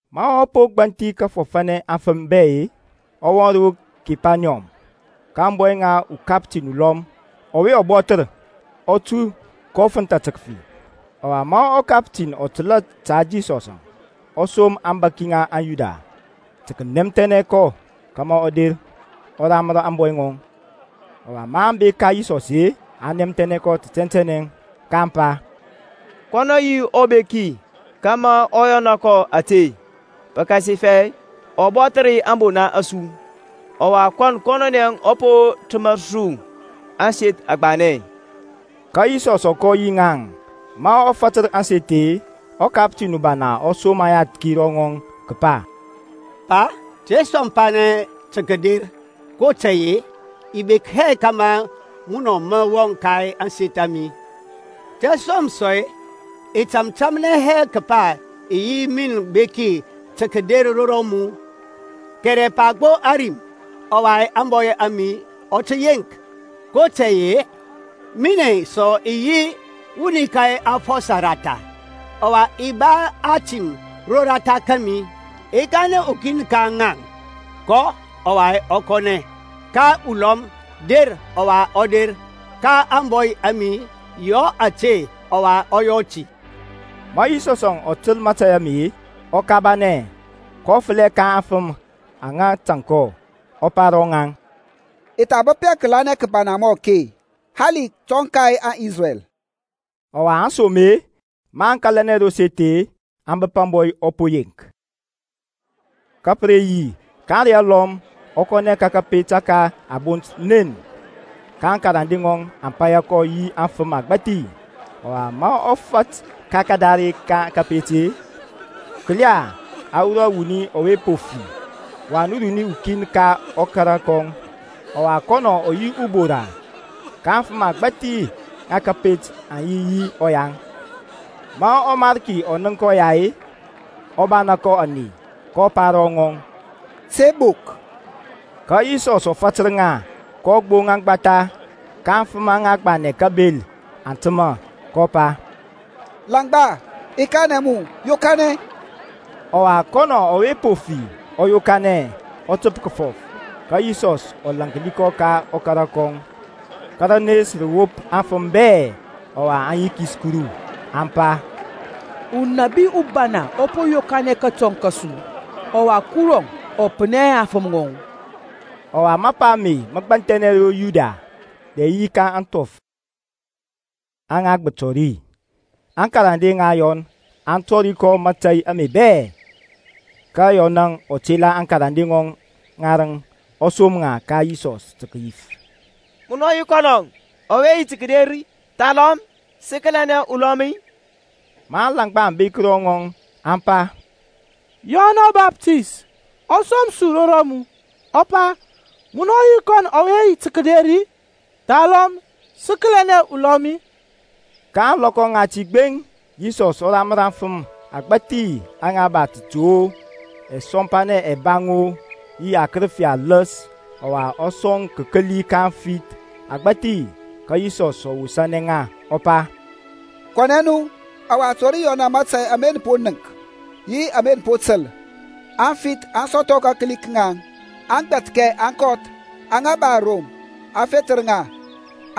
Ma ɔ po gbanthi kəfɔfanɛ aŋfəm bɛ-e, ɔ wɔŋ ro Kepaniyɔm. Ka ȧŋbɔy ŋa ukaptin ulɔm, ɔwe ɔ bɔthər, ɔ tu, kɔ fənthȧ tə kəfi. Ɔwa ma ɔkaptin ɔ təl ta Yisɔsȧŋ, ɔ som aŋbȧki ŋa aŋYuda tə kənɛmthɛnɛ kɔ kȧmȧ ɔ der, ɔ ramər ȧŋbɔy ŋɔŋ. Ɔwa maŋ bek ka Yisɔs-e, aŋ nɛmthɛnɛ kɔ tɛntɛnɛ, kaŋ pa, Kɔn ɔ yi ubeki kȧmȧ mə yɔna kɔ ȧte, pəkasifɛ ɔ bɔthər ȧŋbona a su, ɔwa kɔn kɔnɔnɛ ɔ po təmər su aseth agbanɛ. Ka Yisɔs ɔ kɔ yi ŋaŋ. Ma ɔ fatər ȧŋseth-e, ɔkaptin ubana ɔ som ayathki ro rɔŋɔŋ kəpa, Pa, te sɔmpanɛ tə kəder; kotȧy-e i bek hɛ kȧmȧ munɔ mə wɔŋ ka ȧŋseth a mi. Tȧsom sɔ-e, i tȧmtȧmnɛ hɛ kəpa i yi min beki tə kəder ro rɔmu, kɛrɛ pa gbo ȧrim, ɔwa ȧŋbɔy a mi ɔ tə yeŋk. kotȧy-e minɛ sɔ i yi wuni ka afɔsɔ ratha, ɔwa i ba atim roratha kȧmi. I kanɛ ukin ka ŋaŋ, Kɔ, ɔwa ɔ kɔnɛ; ka ulɔm, Der, ɔwa ɔ der; ka ȧŋbɔy a mi, Yɔ ȧte, ɔwa ɔ yɔ ti. Ma Yisɔs ɔ təl mȧtȧy ame, ɔ kabanɛ, kɔ fəlɛ ka aŋfəm aŋa tȧŋ kɔ, ɔ pa ro ŋaŋ, I tha bəp hɛ kəlanɛ kəbana mɔ ake hali kətɔŋ ka aŋIsrɛl. Ɔwa aŋsom-e, maŋ kȧlanɛ ro seth-e, aŋ bəp ȧŋbɔy ɔ po yeŋk. Ka pə re yi ka ȧŋrey alɔm ɔ kɔnɛ ka kȧpet ȧke a bont Nen, ka aŋkarande ŋɔŋ aŋ paya kɔ yi afəm agbȧthi. Ɔwa, ma ɔ fat ka kadare ka kapet-e, kəla, a wurɔ wuni ɔwe po fi, wan runi ukin ka ɔkara kɔŋ, ɔwa kɔnɔ ɔ yi ubora. Ka afəm agbȧthi ŋa kȧpet aŋ yi yi ɔyaŋ. Ma ɔMarki ɔ nənk ɔya-e, ɔ bana kɔ ȧney, kɔ pa ro rɔŋɔŋ, Te bok. Ka Yisɔsȧŋ ɔ fatər ŋa, kɔ gboŋ aŋgbatha, ka aŋfəm aŋa gbanɛ kabel aŋ təmȧ. Kɔ pa, Langba, i kanɛ mu, yokanɛ. Ɔwa kɔnɔ ɔwe po fi ɔ yokanɛ, ɔ təp kəfɔf. Ka Yisɔs ɔ lȧnki kɔ ka ɔkara kɔŋ. Ka rənes rə wop aŋfəm bɛ; ɔwa aŋ yikis Kuru, aŋ pa, Unabi ubana ɔ po yokanɛ kətɔŋ kȧsu, ɔwa Kuru ɔ pənɛ hɛ aŋfəm ŋɔŋ. Ɔwa mapa ame mə gbanthɛnɛ ro Yudia bɛ yi ka ȧŋthɔf aŋa gbətɔ ri. Aŋkarande ŋa Yɔn aŋ tɔri kɔ mȧtȧy ame bɛ. Ka Yɔnȧŋ ɔ tela akarande ŋɔŋ ŋarəŋ ɔ som ŋa ka Yisɔs tə kəyif, Munɔ yi kɔnɔ ɔwe yi tə kəder-i, thalɔm sə kəlianɛ ulɔm-i? Ma aŋlaŋgba aŋ bek ro ŋɔŋ, aŋ pa, Yɔn ɔbaptist ɔ som su ro rɔmu, ɔ pa, Munɔ yi kɔnɔ ɔwe yi tə kəder-i, thalɔm sə kəlianɛ ulɔm-i? Ka ȧŋlɔkɔ ŋati gbeŋ Yisɔs ɔ ramər afəm agbȧthi aŋa ba tətu-o, ɛsɔmpanɛ ɛbaŋ-o, yi akərəfi aləs, ɔwa ɔ sɔŋ kəkəli ka afith agbȧthi. Ka Yisɔs ɔ wosȧnɛ ŋa ɔ pa, Kɔnɛ nu, ɔwa tɔri Yɔn mȧtȧy ama nə po nənk yi ama nə po təl; aŋfith aŋ sɔthɔ kakəli ka ŋaŋ, aŋgbɛthkɛ aŋ kɔth, aŋa ba arom a fethər ŋa,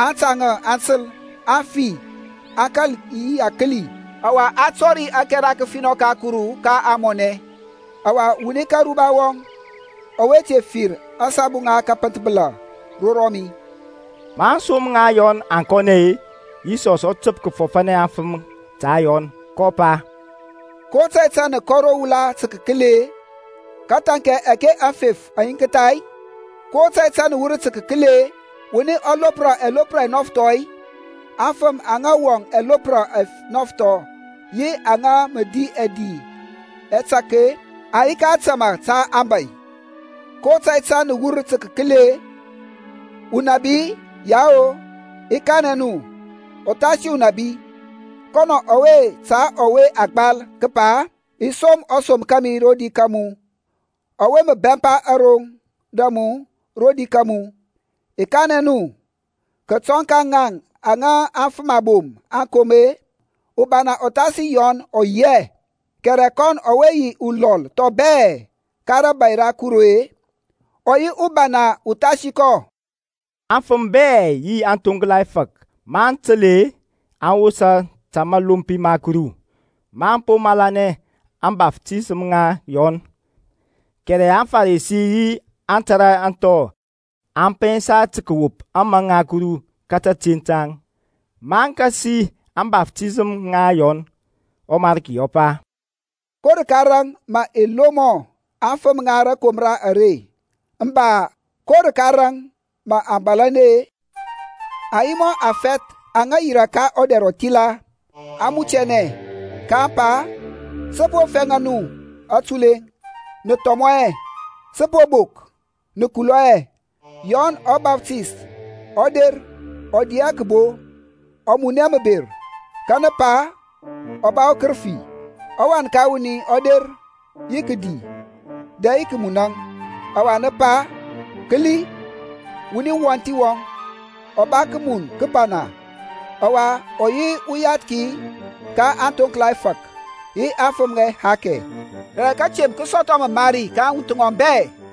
aŋtȧŋȧ aŋ təl, aŋfi aŋ kȧl yi akəli, ɔwa a tɔri ȧkɛra kəfinɔ ka Kuru ka ȧŋmɔnɛ. Ɔwa wuni ka aruba wɔŋ ɔwe te fir asabu ŋa kəpənthbəla ro rɔmi. Ma aŋsom ŋa Yɔn aŋ kɔnɛ-e, Yisɔs ɔ təp kəfɔfanɛ aŋfəm ta Yɔn, kɔ pa, Ko tȧy tȧŋ nə kɔ ro wula tə kəkəli-e? Kəthaŋkɛ ȧke aŋfef aŋ yiŋktha-i? Ko tȧy tȧŋ nə wur tə kəkəli-e? Wuni ɔ lopra ɛlopra ɛnɔfthɔ-i? Aŋfəm aŋa wɔŋ ɛlopra ɛnɔfthɔ yi aŋa mə di ɛdi ɛtȧk-e aŋ yi ka ȧtama ta aŋbȧy. Ko tȧy tȧŋ nə wur tə kəkəli-e? Unabi-i? Yao, i kanɛ nu, uthasi unabi. Kɔnɔ ɔwe ta ɔwe a gbal kəpa, I som ɔsom kȧmi rodi ka mu, ɔwe mə bɛmpa aroŋ da mu rodi ka mu. I kanɛ nu, kətɔŋ ka ŋaŋ aŋa afəm abom aŋ kom-e, ubana uthasi Yɔn ɔ yi hɛ; kɛrɛ kɔn ɔwe yi ulɔl thɔŋ bɛ ka rȧbȧy ra Kuru-e, ɔ yi ubana uthasi kɔ. Aŋfəm bɛ yi aŋthoŋkla ɛfȧk maŋ təl-e, aŋ wosa ta mȧlompi ma Kuru, maŋ po malanɛ ȧŋbaftisəm ŋa Yɔn. Kɛrɛ aŋFarisi yi aŋtara aŋthɔ aŋ pɛnsa tə kəwop ȧmȧŋ ŋa Kuru ta ȧte ŋaŋ, maŋ kasi ȧŋbaftisəm ŋa Yɔn. ƆMariki ɔ pa, Ko rəka raŋ mə i lomɔ aŋfəm ŋa rȧkomra are, mba, ko rəka raŋ mə aŋ bȧlȧnɛ-e? Aŋ yi mɔ afɛth aŋa yirȧ ka ɔdɛr ɔthila, aŋ mutianɛ, kaŋ pa, Sə po fɛŋa nu atuleŋ, nə thɔmɔ hɛ; sə po bok, nə kulɔ hɛ. Yɔn ɔbaptist ɔ der ɔ di hɛ kəbo, ɔ mun hɛ məber, ka nə pa, Ɔ ba ukərəfi. ƆWan ka wuni ɔ der yi kədi dɛ yi kəmunȧŋ, ɔwa nə pa, Kəli, wuni wɔnthi wɔŋ, ɔ ba kəmun kəbana, ɔwa ɔ yi uyathki ka aŋthoŋkla ɛfȧk yi aŋfəm ŋa ɛhakɛ! Kɛrɛ kətemp kə sɔthɔ məmari ka aŋwuth ŋɔŋ bɛ.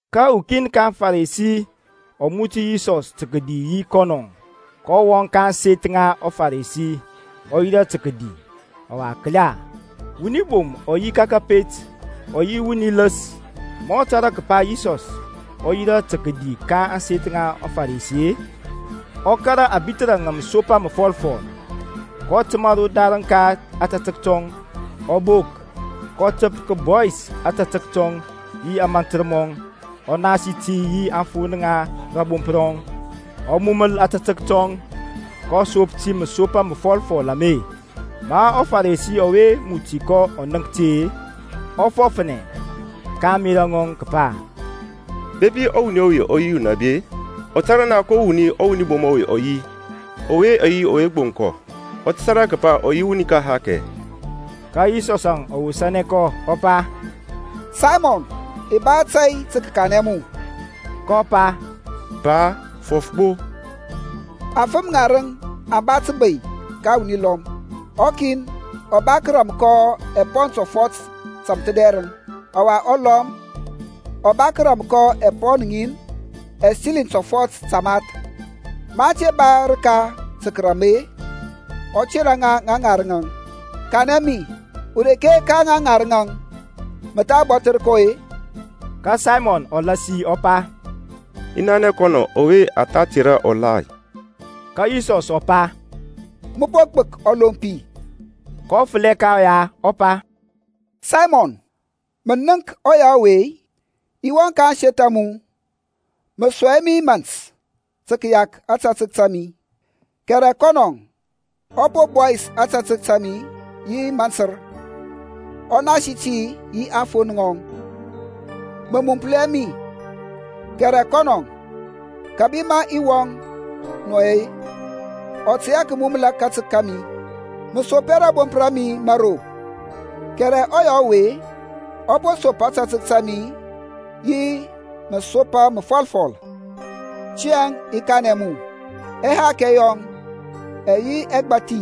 Ka ukin ka aŋFarisi ɔ muti Yisɔs tə kədi yi kɔnɔ, kɔ wɔŋ ka ȧŋseth ŋa ɔFaresi, ɔ yirȧ tə kədi. Ɔwa kəla, wuni bom ɔ yi ka kȧpet, ɔ yi wuni ləs. Ma ɔ tȧrȧ kəpa Yisɔs ɔ yirȧ tə kədi ka ȧŋseth ŋa ɔFarisi-e, ɔ kȧrȧ ȧbithərȧ ŋȧ məsopa məfɔlfɔl, kɔ təmȧ rodarəŋ ka ȧtȧtək tɔŋ, ɔ bok, kɔ təp kəbɔyis ȧtȧtək tɔŋ yi ȧmȧntər mɔŋ, ɔ nasi ti yi aŋfon ŋa rȧbomp rɔŋ, ɔ muməl ȧtȧtək tɔŋ, kɔ sop ti masopa məfɔlfɔl ame. Ma ɔFaresi ɔwe muti kɔ ɔ nənk ti-e, ɔ fɔfnɛ ka ȧŋmerȧ ŋɔŋ kəpa, Bepi ɔwuni ɔwe ɔ yi unabi-e, ɔ tə tȧrȧ naŋ ko wuni ɔwuni bom ɔwe ɔ yi ɔwe gboŋ kɔ; ɔ tə tȧrȧ kəpa ɔ yi wuni ka ɛhakɛ. Ka Yisɔsȧŋ ɔ wosȧnɛ kɔ ɔ pa, Saymɔn, i ba tȧy tə kəkanɛ mu. Kɔ pa, Pa, fɔf gbo. Afəm ŋarəŋ aŋ ba təbey ka wuni lɔm; ɔkin ɔ ba kəram kɔ ɛpɔn tɔfɔt tȧmthədɛrəŋ, ɔwa ɔlɔm ɔ ba kəram kɔ apɔn ŋin ɛsiliŋ tɔfɔt tamath. Maŋ te ba rəka tə kərȧm-e, ɔ tera ŋa ŋarəŋȧŋ. Kanɛ mi ureke ka ŋa ŋarəŋȧŋ mə tha bɔthər kɔ-e? Ka Saymɔn ɔ lasi ɔ pa, I nanɛ kɔn ɔwe ɔ tha tera ɔgbthi. Ka Yisɔs ɔ pa, Mə po gbək ɔlompi. kɔ fəlɛ ka ɔya ɔ pa, Saymɔn, mə nənk ɔya ɔwe-i? I wɔŋ ka ȧŋseth a mu; mə sɔŋ hɛ mi mȧnt ta ȧtȧtək ta mi, kɛrɛ kɔnɔ ɔ po bɔyis ȧtȧtək ta mi yi mantər, ɔ nasi ti yi aŋfon ŋɔŋ. Mə muməl hɛ mi, kɛrɛ kɔnɔ kȧbi ma i wɔŋ nɔ-əŋ, ɔ tey hɛ kəmuməl ȧtȧtək ta mi. Mə sop hɛ rȧbomp ra mi mȧro, kɛrɛ ɔya ɔwe ɔ po sop ȧtȧtək ta mi yi məsopa məfɔlfɔl. Tiyȧŋ i kanɛ mu, ɛhakɛ yɔŋ ɛyɛ yi ɛgbathi,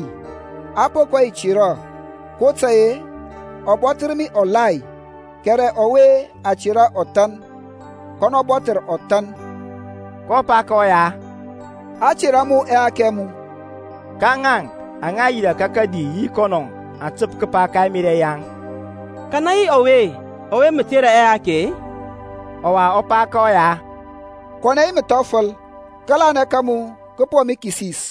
a po kɔ yi tera, kotȧy-e ɔ bɔthər ɔbana; kɛrɛ ɔwe a tera ɔthan, kɔnɔ bɔthər ɔthan. kɔ pa ka ɔya, A tera mu ɛhakɛ ɛ mu. Ka ŋaŋ aŋa yirȧ ka kadi yi kɔnɔ aŋ təp kəpa ka ɛmerȧ yaŋ, Kanɛ yi ɔwe ɔwe mə tera ɛhakɛ sɔ-e? Ɔwa ɔ pa ka ɔya, Kɔnɛ yi məthɔfəl; kȧlanɛ ka mu kə po mu kisis.